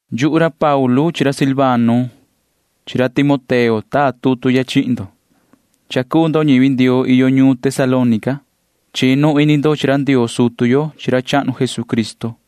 Yuhu ra Paulu chi ra Silvano chi ra Timoteo taa tutu ya chihin ndo, ta maan ndo cuu ñivi Ndioo iyo ñuun Tesalónica. Chinu ini ndo chi ra Ndioo sutu yo chi ra chahnu Jesucristo.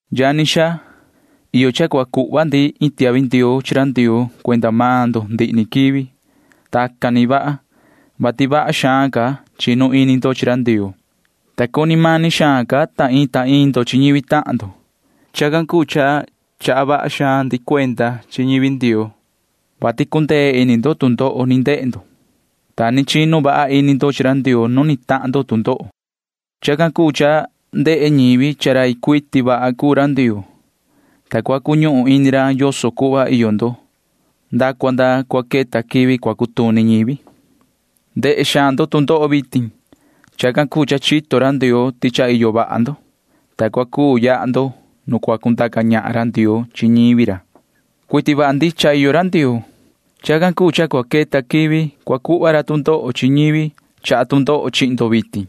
Yani xaa, iyo cha cua cuhva ndi iin tiahvi ndioo chi ra Ndioo cuenda maan ndo ndihi ni quivi. Tacan ni vaha, vati vaha xaan ca chinu ini ndo chi ra Ndioo, ta cuni mani xaan ca ta iin ta iin ndo chi ñivi tahan ndo. Chacan cuu cha chaha vaha xaan ndi cuenda chi ñivi Ndioo, vati cundee ini ndo tu ndoho ni ndehe ndo, ta ni chinu vaha ini ndo chi ra Ndioo nu ni tahan ndo tu ndoho. Chacan cuu cha ndehe ñivi cha rai cuiti vaha cuu ra Ndioo, ta cua cuñuhun ini ra yoso cuhva iyo ndo nda cua nda cua queta quivi cua cutuni ñivi. Ndehe xaan ndo tu ndoho vitin. [Chacan cuu cha chito ra Ndioo ti cha iyo vaha ndo,] ta cua cuu yaha ndo nu cua cundaca ñahan ra Ndioo chi ñivi ra. Cuiti vaha ndicha iyo ra Ndioo. Chacan cuu cha cua queta quivi cua cuhva ra tu ndoho chi ñivi chaha tu ndoho chi maan ndo vitin.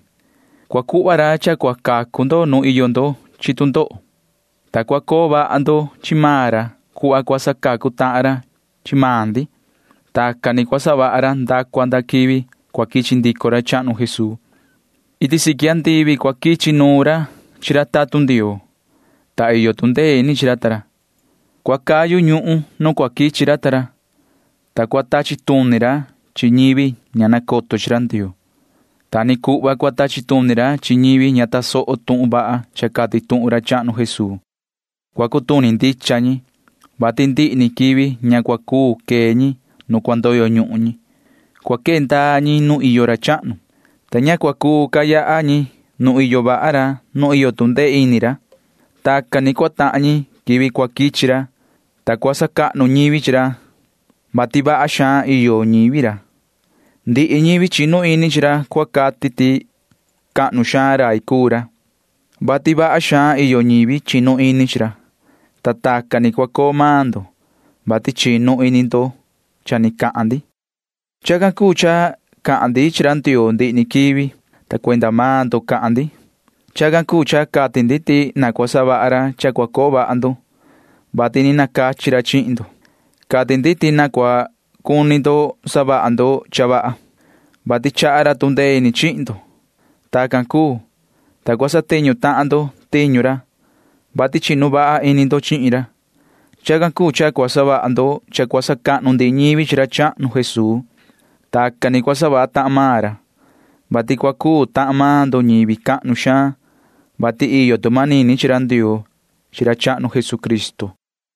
Cua cuhva ra cha cua cacu ndo nu iyo ndo chi tu ndoho, ta cua coo vaha ndo chi maan ra cuhva cua sacacu tahan ra chi maan ndi. Tacan ni cua savaha ra nda cua nda quivi cua quichi ndico ra chahnu Jesuu. Iti siqui andivi cua quichi nuun ra chi ra tatun Ndioo, ta iyo tu ndee ini chi ra ta ra. Cua cayu ñuhun nu cua quichi ra ta ra, ta cua tachi tuni ra chi ñivi ña nacoto chi ra Ndioo. Ta ni cuhva cua tachi tuni ra chi ñivi ña tasoho tuhun vaha cha cati tuhun ra chahnu Jesuu. Cua cutuni ndicha ñi, vati ndihi ni quivi ña cua cuu quee ñi nu cua ndoyo ñuhun ñi. Cua quee ndaa ñi nu iyo ra chahnu, ta ña cua cuu ca yaha ñi nu iyo vaha ra nu iyo tu ndee ini ra. Tacan ni cua tahan ñi quivi cua quichi ra, ta cua sacahnu ñivi ra chi ra, vati vaha xaan iyo ñivi ra. Ndihi ñivi chinu ini chi ra cua cati ti cahnu xaan rai cuu ra, vati vaha xaan iyo ñivi chinu ini chi ra, ta tacan ni cua coo maan ndo, vati chinu ini ndo cha ni cahan ndi. Chacan cuu cha cahan ndi chi ra Ndioo ndihi ni quivi, ta cuenda maan ndo cahan ndi. Chacan cuu cha cati ndi ti na cua savaha ra cha cua coo vaha ndo, vati ni nacachi ra chihin ndo. Cati ndi ti na cua cuni ndo savaha ndo cha vaha, vati chaha ra tu ndee ini chihin ndo. Tacan cuu, ta cua satiñu tahan ndo tiñu ra, vati chinu vaha ini ndo chihin ra. Chacan cuu cha cua savaha ndo cha cua sacahnu ndihi ñivi chi ra chahnu Jesuu. Tacan ni cua savaha tahan maan ra, vati cua cuu tahan maan ndo ñivi cahnu xaan, vati iyo tu manini chi ra Ndioo chi ra chahnu Jesucristo.